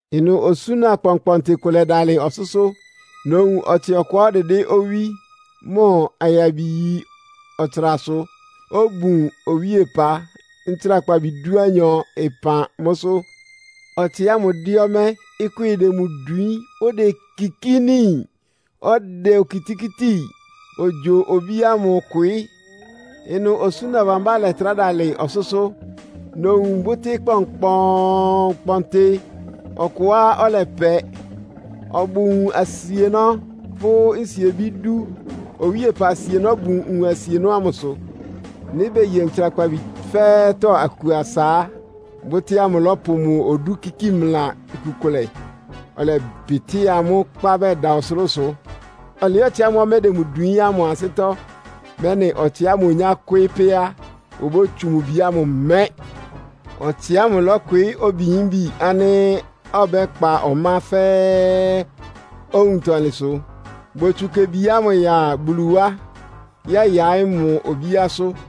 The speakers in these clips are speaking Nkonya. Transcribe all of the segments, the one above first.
Ɩnʋ osúna kpɔnkpɔntɩ kʋ lɛ́dalɩ ɔsʋ́sʋ́. Nowun ɔtsɩ ɔkʋá ɔdɩdɩ́ owí, mʋ ayabi yí ɔtsrasʋ. Obun owíepa, ntsrakpabi dúanyɔ ɩpan mʋ́sʋ́. Ɔtsɩ ámʋ dɛ́ ɔmɛ́, ɩkwɩ́ɩ dɛ mʋ dwiín, odekikíni, ɔdɛ okitikíti ogyo obí ámʋ kwɩɩ́. Ɩnʋ osúna bámbá lɛtrá dalɩ ɔsʋ́sʋ́. Nowun bʋ́tɩ́ kpɔnkpɔɔnkpɔntɩ ɔkʋá ɔlɛpɛ, ɔbʋ nwun asienɔ́ pʋ́ nsiebí dú. Owíepa asienɔ́ bun nwun asienɔ́ ámʋsʋ. Nɩ́ beye ntsrakpabi fɛ́ɛ́tɔ́ aku asa á, bʋtɩ́ ámʋ lɔ́pʋ mʋ odú kíki mla iku kʋlɛ, ɔlɛbɩtɩ́a mʋ́ kpá bɛda ɔsʋlʋ́sʋ. Ɔlɩɩ́ ɔtsɩ ámʋ́ʋ́ ɔmɛ́ dɛ mʋ dwiín ámʋ ansɩ́tɔ́, mɛ́nɩ ɔtsɩ ámʋ onyá kwɩ́ɩ́ pɛ́ á, obótsu mʋ bi ámʋ mɛ́. Ɔtsɩ ámʋ lɔ́kwɩɩ́ obiyímbi ánɩ́ ɔbɛ́kpa ɔmá fɛ́ɛ́ owuntɔlɩnsʋ. Botsu kebi ámʋ ya Bulu wá, yɛ́yaɩ́ mʋ obíásʋ́.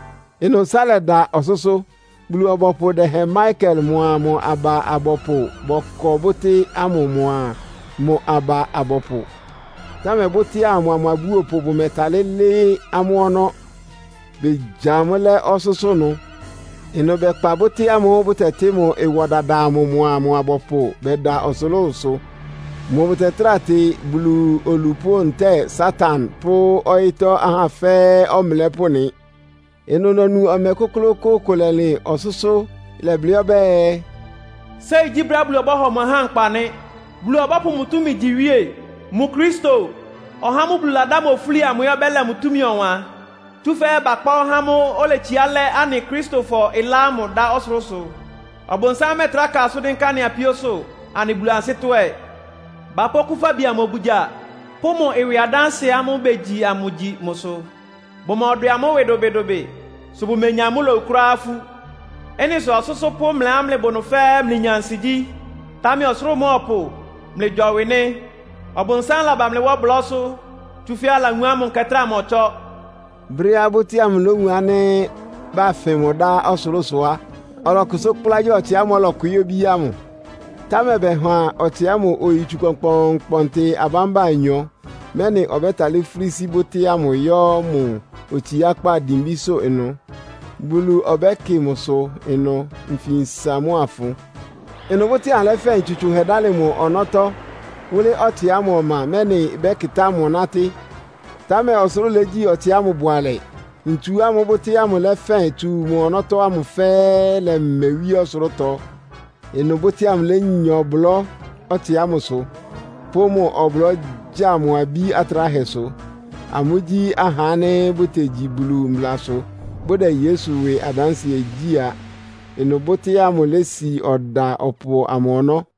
Ɩnʋ, ɩsá lɛda ɔsʋ́sʋ́. Bulu-ɔbɔpʋ dɛhɛn Mikael mʋa mʋ aba abɔpʋ bɔkɔ bʋ́tɩ́ ámʋ mʋa mʋ aba abɔpʋ. Támɛ bʋ́tɩ́ ámʋ mʋa mʋ abúopʋ bʋmɛtalɩ́ lɩ́ɩ́ amʋ́ ɔnɔ́, begya amʋ́ lɛ́ ɔsʋ́sʋ́ ɩnʋ. Ɩnʋ bɛkpa bʋ́tɩ́ ámʋ́ʋ́ bʋtɛtɩ́ mʋ ɩwɔ dada amʋ mʋa mʋ abɔpʋ bɛda ɔsʋlʋ́sʋ. Mʋ bʋtɛtráa tɩ Bulu olupʋ́ ntɛ́ɛ Satan pʋ́ ɔyɩ́tɔ́ ahá fɛ́ɛ́ ɔmlɛ́pʋ́ nɩ. Ɩnʋ nonu ɔmɛ kʋ́klʋ́kʋ́ʋ́ kʋ lɛlɩn ɔsʋ́sʋ́. Ɩlɛblɩ́ ɔbɛ́ɛ, “Séi gyí brɛ́á Bulu ɔbɔ́hɔ mʋ ahá nkpa nɩ́! Bulu ɔbɔ́pʋ mʋ túmi gyi iwíe. Mʋ Kristo, (ɔhá ámʋ́ʋ́ Bulu ladá mʋ ofúli amʋ) ɛ́ ɔbɛ́lɛ mʋ túmi ɔwan. Tsúfɛ́ bakpá ɔhá ámʋ́ʋ́ oletsiá lɛ́ anɩ Akristofɔ ɩlá ámʋ dá ɔsʋlʋ́sʋ. Ɔbʋnsám mɛ́ɛtrá ka asʋ́n dɩ́nká anɩ apíósʋ́, anɩ Bulu ansɩ́tɔ́ ɛ. Bapʋ́ Okúfabi amʋ obugya pʋ́ mʋ ɩwɩ adánsɩɛ ámʋ́ʋ́ begyi amʋ gyi mʋsʋ. Bʋmɔdwɛ amʋ́ ɩwɩ dʋbɩdʋbɩ, sʋ bʋmenya amʋ́ lowu kʋ́ráá ifú. Ɩ́nɩ sʋ ɔsʋ́sʋ́ pʋ́ mlɩá mlɩbʋ ɩnʋ fɛ́ɛ́ mlɩnya ansigyí. Támɛ ɔsʋlʋ́ʋ mʋa ɔpʋ, mlɩgyɔwɩ nɩ́. Ɔbʋnsám laba mlɩ wá ɔblɔ́sʋ́, tsúfɛ́ alawun ánɩ́ mʋ nkɛ trá mɔtsɔ́.” Brɛ́á bʋ́tɩ́ ámʋ lówun ánɩ́ bafɩn mʋ dá ɔsʋlʋ́sʋ á, ɔlɔkʋsʋ́ kplá gya ɔtsɩ ámʋ́ʋ́ ɔlɔkwɩɩ́ obí ámʋ. Támɛ bɛha ɔtsɩ ámʋ oyitsu kpɔnkpɔɔnkpɔntɩ abámba anyɔ, mɛ́nɩ ɔbɛ́talɩ́ fúlí sí bʋ́tɩ́ ámʋ yɔ́ mʋ otsiákpá dimbísʋ́ ɩnʋ. Bulu ɔbɛ́kɩ mʋsʋ ɩnʋ nfinsa mʋ́a ɩfʋn. Ɩnʋ bʋ́tɩ́ ámʋ lɛ́fɛn ntsu tsʋnhɛ dálɩ mʋ ɔnɔ́tɔ́ wʋ́lɩ́ ɔtsɩ ámʋ ɔma, mɛ́nɩ ɩbɛ́kɩtá mʋ nátɩ́. Támɛ ɔsʋlʋ́ʋ légyí ɔtsɩ ámʋ bʋalɛ. Ntsu ámʋ́ʋ́ bʋ́tɩ́ ámʋ lɛ́fɛ́n tsu mʋ ɔnɔ́tɔ́ ámʋ fɛ́ɛ́ lɛmɛ wíé ɔsʋlʋ́tɔ. Ɩnʋ bʋ́tɩ́ ámʋ lénya ɔblɔ́ ɔtsɩ ámʋsʋ, pʋ́ mʋ ɔblɔ́ gya mʋ abí atráhɛsʋ. Amʋ́gyí ahá ánɩ́ bʋtegyi Bulu mblasʋ, bʋdɛ Yesu ɩwɩ adánsɩɛ gyí a. Ɩnʋ bʋ́tɩ́ ámʋ lési ɔda ɔpʋ amʋ ɔnɔ́.